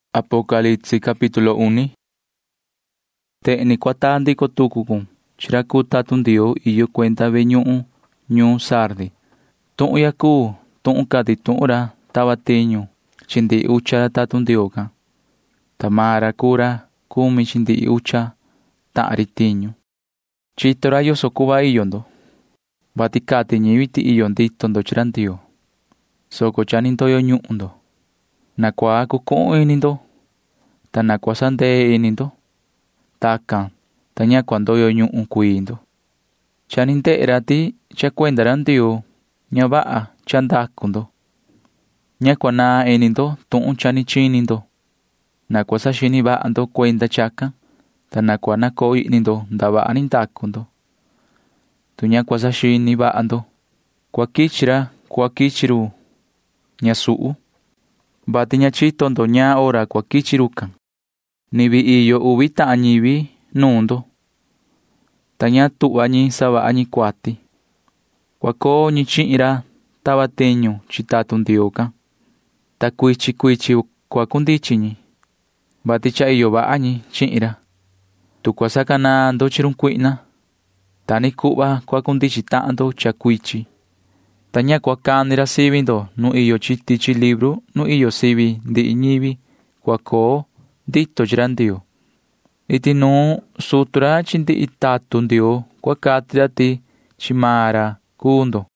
[Ni vii cahan racan chihin yu:] ’Tehen ni cua taa ndico tucu cun chi ra cuu tatun Ndioo iyo cuenda ve ñuhun ñuun Sardi: “Tuhun ya cuu tuhun cati tuhun ra tava tiñu chi ndihi ucha ra tatun Ndioo can, ta maan ra cuu ra cumi chi ndihi ucha tahan ri tiñu. Chito ra yoso cuhva iyo ndo, vati cati ñivi ti iyo ndito ndo chi ra Ndioo, soco cha ni ndoyo ñuhun ndo. Na cua cucuhun ini ndo, ta na cua sandee ini ndo. Tacan, ta ña cua ndoyo ñuhun cuii ndo. Cha ni ndehe ra ti cha cuenda ra Ndioo―ña vaha cha ndacu ndo. Ña cua naan ini ndo tuhun cha ni chini ndo. Na cua saxini vaha ndo cuenda chacan, ta na cua nacoo ihni ndo ndavaha ni ndacu ndo. Tu ña cua saxini vaha ndo, cua quichi ra cuhva quichi run ñasuhu, vati ña chito ndo ñaan hora cua quichi rucan. Ni vii iyo uvi tahan ñivi nuun ndo, ta ña tuhva ñi savaha ñi cuati. Cua coo ñi chihin ra tava tiñu chi tatun Ndioo can, ta cuichin cuichin cua cundichin ñi, vati cha iyo vaha ñi chihin ra. Tu cua sacanaan ndo chi run cuihna, ta ni cuhva cua cundichin tahan ndo cha cuichin, ta ña cua cani ra sivi ndo nu iyo chi tichi libru nu iyo sivi ndihi ñivi cua coo ndito chi ra Ndioo. Iti nuun sutu ra chi ndihi tatun Ndioo cua cati ra ti chi maan ra cuu ndo.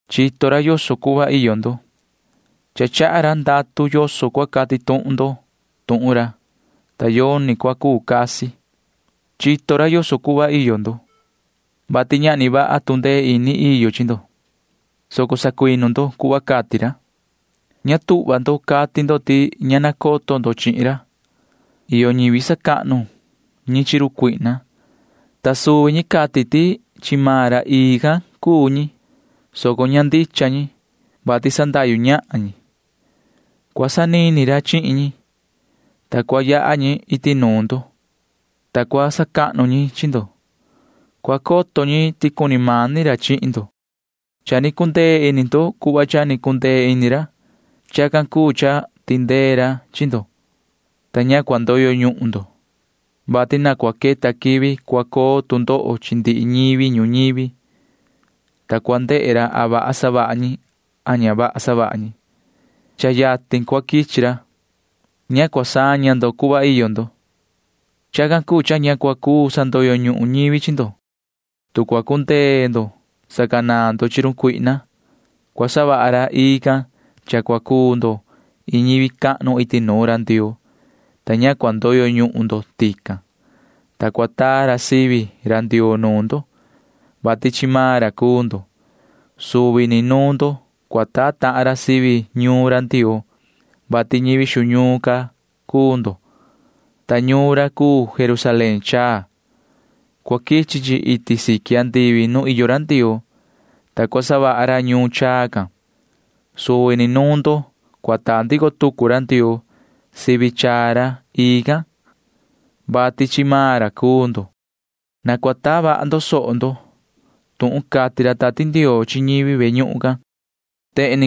Chito ra yoso cuhva iyo ndo. Cha chaha ra ndatu yoso cua cati tuhun ndo tuhun ra, ta yoni cua cuu casi. Chito ra yoso cuhva iyo ndo, vati ñahni vaha tu ndee ini iyo chi ndo, soco sacuinu ndo cuhva cati ra. Ña tuhva ndo cati ndo ti ña nacoto ndo chihin ra. Iyo ñivi sacahnu ñi chi run Satanaa, ta suvi ñi cati ti chi maan ra ii can cuu ñi, soco ña ndicha ñi, vati sandahyu ñahan ñi. Cua sanini ra chihin ñi, ta cua yaha ñi iti nuun ndo, ta cua sacahnu ñi chi ndo. Cua coto ñi ti cuni mani ra chihin ndo. Cha ni cundee ini ndo cuhva cha ni cundee ini ra. Chacan cuu cha tindee ra chi ndo, ta ña cua ndoyo ñuhun ndo, vati cha cua queta quivi cua coo tu ndoho chi ndihi ñivi ñuñivi, ta cua ndehe ra a vaha ñi a ña vaha ñi. Cha yatin cua quichi ra. Ña cua saña ndo cuhva iyo ndo. Chacan cuu cha ña cua cuu sandoyo ñuhun ñivi chi ndo. Tu cua cundee ndo sacanaan ndo chi run cuihna, cua savaha ra ii can cha cua cuu ndo iin ñivi cahnu iti nuun ra Ndioo, ta ña cua ndoyo ñuhun ndo tican. Nuun ndo cua taa ra sivi ra Ndioo, vati chi maan ra cuu ndo. Suvi ni nuun ndo cua taa tahan ra sivi ñuun ra Ndioo, vati ñivi xu ñuun can cuu ndo, ta ñuun ra cuu Jerusalén chaa. Cua quichi chi iti siqui andivi nu iyo ra Ndioo, ta cua savaha ra ñuun chaa can. Suvi ni nuun ndo cua taa ndico tucu ra Ndioo sivi chaa ra ii can, vati chi maan ra cuu ndo. Na cua taa vaha ndo soho ndo tuhun cati ra Tati Ndioo chi ñivi ve ñuhun can, cati ra.”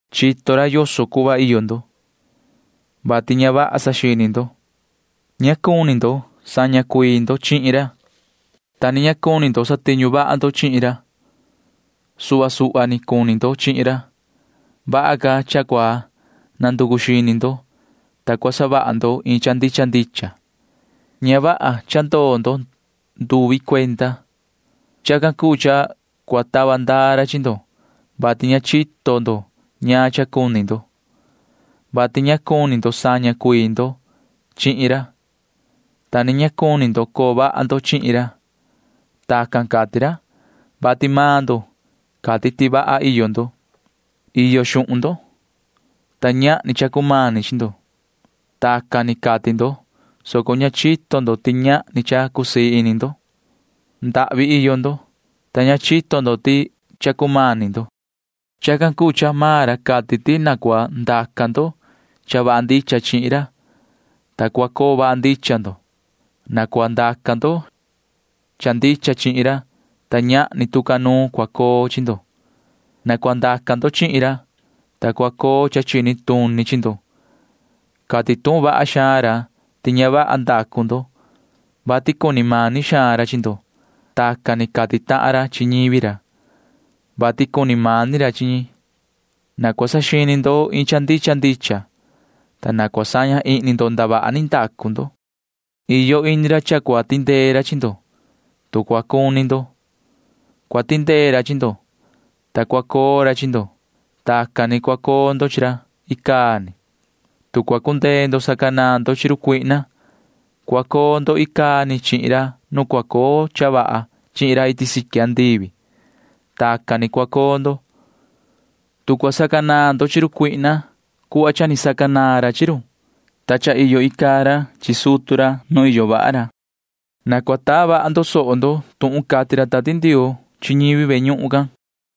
Chito ra yoso cuhva iyo ndo, vati ña vaha saxini ndo. Ña cuni ndo saña cuii ndo chihin ra, ta ni ña cuni ndo satiñu vaha ndo chihin ra. Suhva suhva ni cuni ndo chihin ra. Vaha ca cha cua nanducu xini ndo, ta cua savaha ndo iin cha ndicha ndicha. Ña vaha cha ndoo ndo nduvi cuenda. Chacan cuu cha cua tava ndaa ra chi ndo, vati ña chito ndo ñaan cha cuni ndo, vati ña cuni ndo saña cuii ndo chihin ra, ta ni ña cuni ndo coo vaha ndo chihin ra. Tacan cati ra, vati maan ndo cati ti vaha iyo ndo. Iyo xuhun ndo, ta ñahni cha cumani chi ndo. Tacan ni cati ndo, soco ña chito ndo ti ñahni cha cusii ini ndo. Ndahvi iyo ndo, ta ña chito ndo ti cha cumani ndo. Chacan cuu cha maan ra cati ti na cua ndaca ndo cha vaha ndicha chihin ra, ta cua coo vaha ndicha ndo. Na cua ndaca ndo cha ndicha chihin ra, ta ñahni tu ca nuun cua coo chi ndo. Na cua ndaca ndo chihin ra, ta cua coo cha chini tuni chi ndo. Cati tuhun vaha xaan ra ti ña vaha ndacu ndo, vati cuni mani xaan ra chi ndo. Tacan ni cati tahan ra chi ñivi ra, vati cuni mani ra chi ñi. Na cua saxini ndo iin cha ndicha ndicha, ta na cua saña ihni ndo ndavaha ni ndacu ndo. Iyo ini ra cha cua tindee ra chi ndo. Tu cua cuni ndo, cua tindee ra chi ndo, ta cua coo ra chi ndo. Tacan ni cua coo ndo chi ra icaa ni. Tu cua cundee ndo sacanaan ndo chi run cuihna, cua cuhva ra ndicha can cha cua coo ndo icaa ni chihin ra nu cua coo cha vaha chihin ra iti siqui andivi. Tacan ni cua coo ndo, tu cua sacanaan ndo chi run cuihna cuhva ni sacanaan ra chi run, ta cha iyo icaa ra chi sutu ra nu iyo vaha ra. Na cua taa vaha ndo soho ndo tuhun cati ra Tati Ndioo chi ñivi ve ñuhun can, cati ra.”